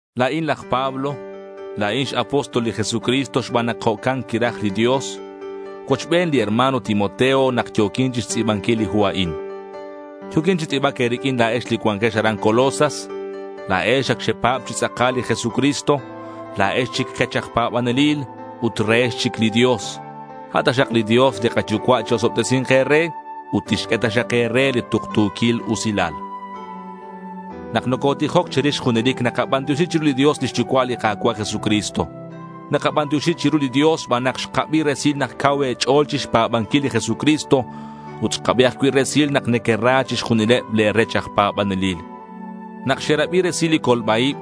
La̱in laj Pablo. La̱in x-apóstol li Jesucristo xban nak jo'can quiraj li Dios. Cuochben li hermano Timoteo nak yo̱quin chixtz'i̱banquil li hu a'in. Yo̱quin chi tz'i̱bac e̱riq'uin la̱ex li cuanquex aran Colosas. La̱ex ac xepa̱b chi tz'akal li Jesucristo. La̱ex chic kech aj pa̱banelil ut rehex chic li Dios. A' taxak li Dios li kaYucua' chi-osobtesi̱nk e̱re ut tixq'ue taxak e̱re li tuktu̱quil usilal. Nak nocotijoc che̱rix junelic nakabantioxi chiru li Dios lix Yucua' li Ka̱cua' Jesucristo. Nakabantioxi chiru li Dios xban nak xkabi resil nak cau e̱ch'o̱l chixpa̱banquil li Jesucristo ut xkabi ajcui' resil nak nequera chixjunileb le̱ rech aj pa̱banelil. Nak xerabi resil li colba-ib,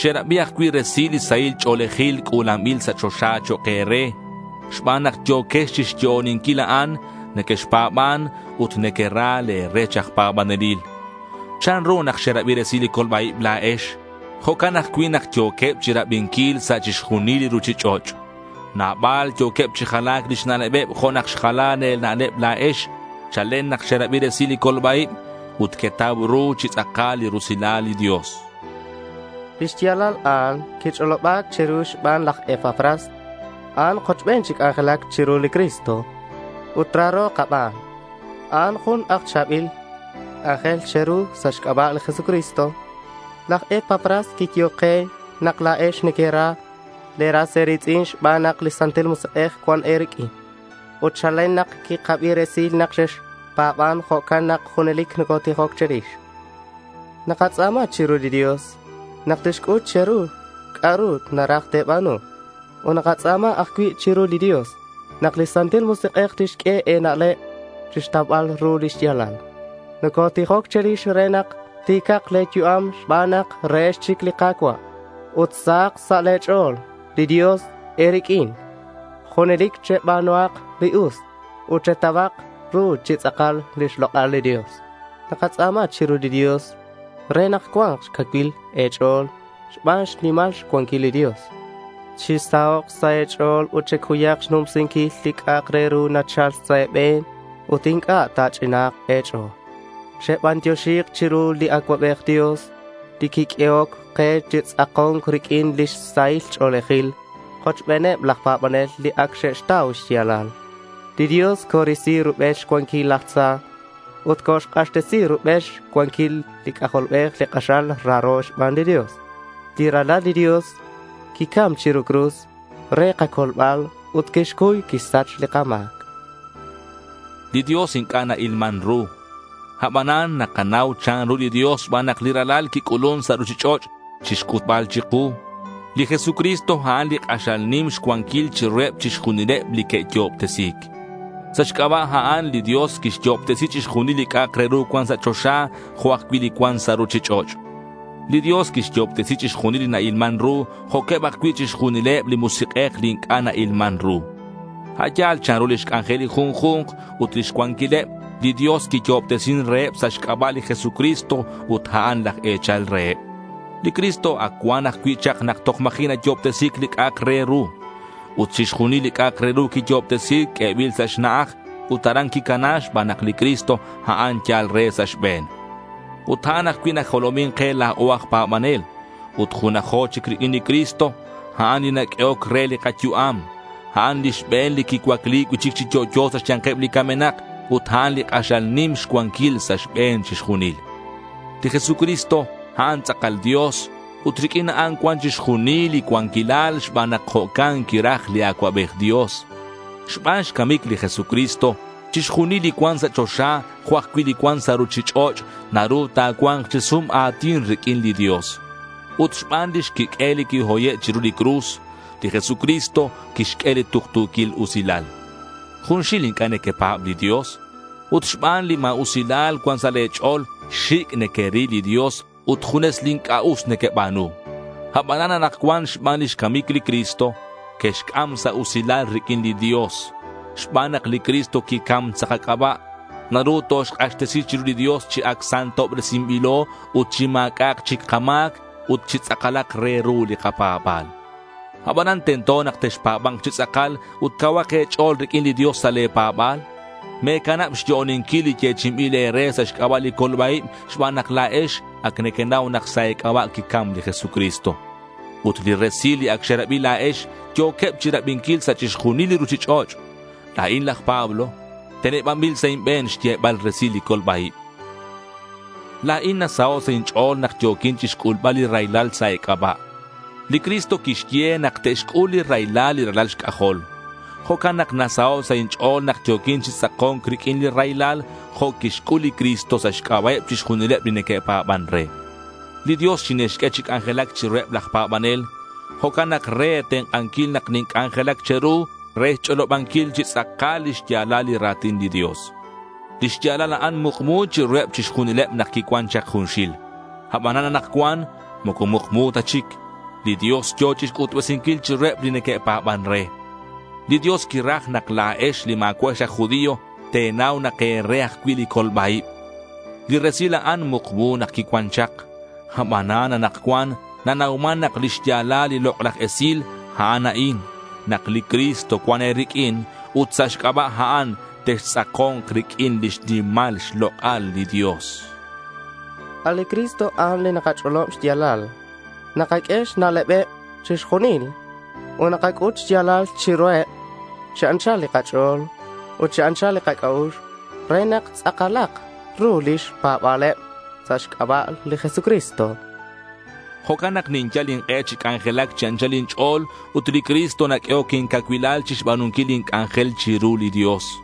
xerabi ajcui' resil li sahil ch'o̱lejil c'u̱lanbil sa' choxa chok' e̱re. Xban nak yo̱quex chixyo'oninquil a'an, nequexpa̱ban ut nequera le̱ rech aj pa̱banelil. Chanru nak xerabi resil li colba-ib la̱ex, jo'can ajcui' nak yo̱queb chirabinquil sa' chixjunil li ruchich'och'. Nabal yo̱queb chi jalac lix na'lebeb jo' nak xjala le̱ na'leb la̱ex chalen nak xerabi resil li colba-ib ut quetau ru chi tz'akal li rusilal li Dios. Lix ya̱lal a'an quich'oloba̱c che̱ru xban laj Epafras. A'an kochben chi c'anjelac chiru li Cristo ut raro kaban. A'an jun cha̱bil aj c'anjel che̱ru sa' xc'aba' li Jesucristo. Laj Epafras quiyehoc ke nak la̱ex nequera e̱ras e̱ri̱tz'in xban nak li Santil Musik'ej cuan e̱riq'uin. Ut chalen nak quikabi resil nak xexpa̱ban, jo'can nak junelic nocotijoc che̱rix. Nakatz'a̱ma chiru li Dios nak tixc'ut che̱ru c'a'ru naraj te̱ba̱nu. Ut nakatz'a̱ma ajcui' chiru li Dios nak li Santil Musik'ej tixq'ue e̱na'leb chixtaubal ru li xya̱lal. Nocotijoc che̱rix re nak ti̱cak le̱ yu'am xban nak rehex chic li Ka̱cua' ut sahak sa' xch'o̱l li Dios e̱riq'uin. Junelic cheba̱nuhak li us ut chetauhak ru chi tz'akal lix lok'al li Dios. Nakatz'a̱ma chiru li Dios re nak cua̱nk xcacuil e̱ch'o̱l xban xnimal xcuanquil li Dios. Chisahok' sa' e̱ch'o̱l ut checuyak xnumsinquil li c'a'ak re ru nachal sa' e̱be̱n ut inc'a' ta̱ch'ina̱nk e̱ch'o̱l. Chebantioxi chiru li Acuabej Dios li quiq'uehoc ke chitz'ako̱nk riq'uin li sahil ch'o̱lejil kochbeneb laj pa̱banel li ac xe'xtau xya̱lal. Li Dios corisi rubel xcuanquil laj tza ut coxk'axtesi rubel xcuanquil li C'ajolbej li k'axal raro xban li Dios. Li Ralal li Dios quicam chiru li cruz re kacolbal ut quixcuy quixsach li kama̱c. Li Dios inc'a' na-ilman ru. Abanan nakanau chanru li Dios xban nak li Ralal quic'ulun sa' ruchich'och' chixc'utbal chiku. Li Jesucristo a'an li k'axal nim xcuanquil chiruheb chixjunil li que'yo'obtesi̱c. Sa' xc'aba' a'an, li Dios quixyo'obtesi chixjunil li c'a'ak re ru cuan sa' choxa, jo' ajcui' li cuan sa' ruchich'och'. Li Dios quixyo'obtesi chixjunil li na-ilman ru, jo'queb ajcui' chixjunileb li musik'ej, li inc'a' na-ilman ru. A' yal chanru lix c'anjel li junju̱nk ut lix cuanquileb, li Dios quiyo'obtesin reheb sa' xc'aba' li Jesucristo ut a'an laj e̱chal reheb. Li Cristo ac cuan ajcui' chak nak toj ma̱ji' neque'yo'obtesi̱c li c'a'ak re ru. Ut chixjunil li c'a'ak re ru quiyo'obtesi̱c q'uebil sa' xna'aj ut aran quicana xban nak li Cristo a'an yal re sa' xbe̱n. Ut a'an ajcui' najolomin ke la̱o aj pa̱banel ut junajo chic riq'uin li Cristo. A'an li naq'uehoc re li kayu'am. A'an li xbe̱n quicuacli cui'chic chi yo'yo sa' xya̱nkeb li camenak ut a'an li k'axal nim xcuanquil sa' xbe̱n chixjunil. Li Jesucristo, a'an tz'akal Dios ut riq'uin a'an cuan chixjunil li cuanquilal xban nak jo'can quiraj li Acuabej Dios. Xban xcamic li Jesucristo, chixjunil li cuan sa' choxa jo' ajcui' li cuan sa' ruchich'och' naru ta̱cua̱nk chi sum a̱tin riq'uin li Dios. Ut xban lix quiq'uel li quihoye' chiru li cruz, li Jesucristo quixq'ue li tuktu̱quil usilal. Junxil inc'a' nequepa̱b li Dios. Ut xban li ma̱usilal cuan sa' le̱ ch'o̱l, xic' nequeril li Dios ut junes li inc'a' us nequeba̱nu. Abanan anakcuan xban lix camic li Cristo quexc'am sa' usilal riq'uin li Dios. Xban nak li Cristo quicam sa' kac'aba', naru toxk'axtesi chiru li Dios chi ac santobresinbilo ut chi ma̱c'a'ak chic kama̱c ut chi tz'akalak re ru li kapa̱ba̱l. Abanan tento nak texpa̱ba̱nk chi tz'akal ut cauhak e̱ch'o̱l riq'uin li Dios sa' le̱ pa̱ba̱l. Me̱canab xyo'oninquil li yechi'inbil e̱re sa' xc'aba' li colba-ib xban nak la̱ex ac nequenau nak sa' e̱c'aba' quicam li Jesucristo. Ut li resil li ac xerabi la̱ex yo̱queb chirabinquil sa' chixjunil li ruchich'och'. La̱in laj Pablo, tenebanbil sa' inbe̱n xyebal resilal li colba-ib. La̱in nasaho' sa' inch'o̱l nak yo̱quin chixc'ulbal li raylal sa' e̱c'aba'. Li Cristo quixye nak te'xc'ul li raylal li ralal xc'ajol. Jo'can nak nasaho' sa' inch'o̱l nak yo̱quin chi tz'ako̱nc riq'uin li raylal jo' quixc'ul li Cristo sa' xc'aba'eb chixjunileb li neque'pa̱ban re. Li Dios xinixq'ue chi c'anjelac chiruheb laj pa̱banel. Jo'can nak re e̱tenk'anquil nak ninc'anjelac che̱ru re xch'olobanquil chi tz'akal lix ya̱lal li ra̱tin li Dios. Li xya̱lal a'an mukmu chiruheb chixjunileb nak quicuan chak junxil. Abanan anakcuan moco mukmu ta chic. Li Dios yo̱ chixc'utbesinquil chiruheb li neque'pa̱ban re. Li Dios quiraj nak la̱ex li ma̱cua'ex aj judío, te̱nau nak e̱re ajcui' li colba-ib. Li resil a'an mukmu nak quicuan chak. Abanan anakcuan nanauman nak lix ya̱lal li lok'laj esil, a'an a'in: Nak li Cristo cuan e̱riq'uin ut sa' xc'aba' a'an textz'ako̱nk riq'uin lix nimal xlok'al li Dios. A' li Cristo, a'an li nakach'olob xya̱lal. Nakaq'ue xna'lebeb chixjunil ut nakac'ut xya̱lal chiruheb chi anchal li kach'o̱l ut chi anchal li kac'a'ux re nak tz'akalak ru lix pa̱ba̱leb sa' xc'aba' li Jesucristo. Jo'can nak ninyal ink'e chi c'anjelac chi anchal inch'o̱l ut li Cristo naq'uehoc incacuilal chixba̱nunquil lin c'anjel chiru li Dios.